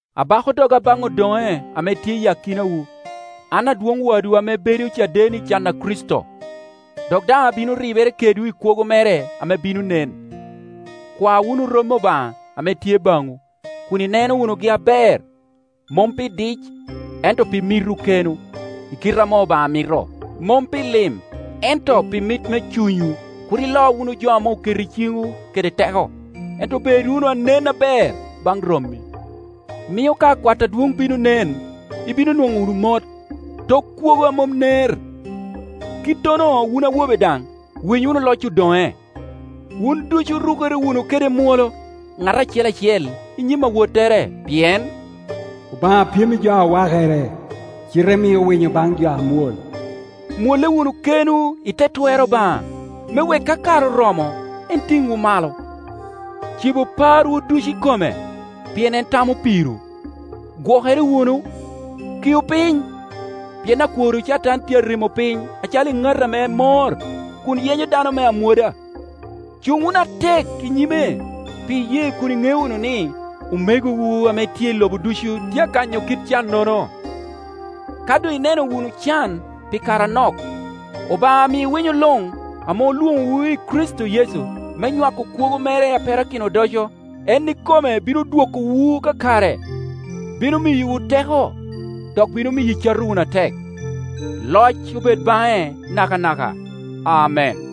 Abako doga baŋ odoŋe ame tye i akinawu, an adwoŋ wadwu ame bedo caden i can a Kricito, dok daŋ abino ribere kedwu i kwogo mere ame bino nen. Kwa wunu rommi Obaŋa ame tye baŋwu, kun ineno wunugi aber, mom pi dic, ento pi mitwu kenwu, i kite ame Obaŋa mito, mom pi lim ento pi mit me cunywu. Kur ilo wunu jo ame oketo i ciŋwu kede teko, ento bed wunu anen aber baŋ rommi; mio ka Akwat adwoŋ bino nen, ibino nwoŋo wunu mot, tok kwogo a mom ner. Kittono wun awobe daŋ, winy wunu loc odoŋe. Wun ducu rukere wunu kede mwolo, ŋat acel acel i nyim awottere, pien “Obaŋa pyem i jo a wakere, cite mio winyo baŋ jo a amwol.” Mwolle wunu kenwu i te twer Obaŋa, me wek ka kare oromo, en tiŋwu malo. Cibu parwu ducu i kome, pien en tamo pirwu. Gwokere wunu, kiu piny, pien akworwu Catan tye a rimo piny calo eŋato ame mor, kun yenyo dano me amwoda. Cuŋ wunu atek i nyime pi iyee kun iŋeo wunu ni, omegowu ame tye i lobo ducu tye a kanyo kit cannono. Ka doŋ ineno wunu can pi kare anok, Obaŋa ami winyo luŋ, ame olwoŋowu i Kricito Yecu me nywako kwogo mere a perakino odoco, en ikome bino dwokowu kakare, bino miyowu teko, dok bino miyo icato wunu atek. Loc obed baŋe nakanaka. Amen.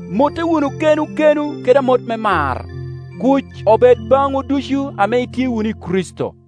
Motte wunu kenwu kenwu kede amot me mar. Kuc obed baŋwu ducu ame itye wunu i Kricito.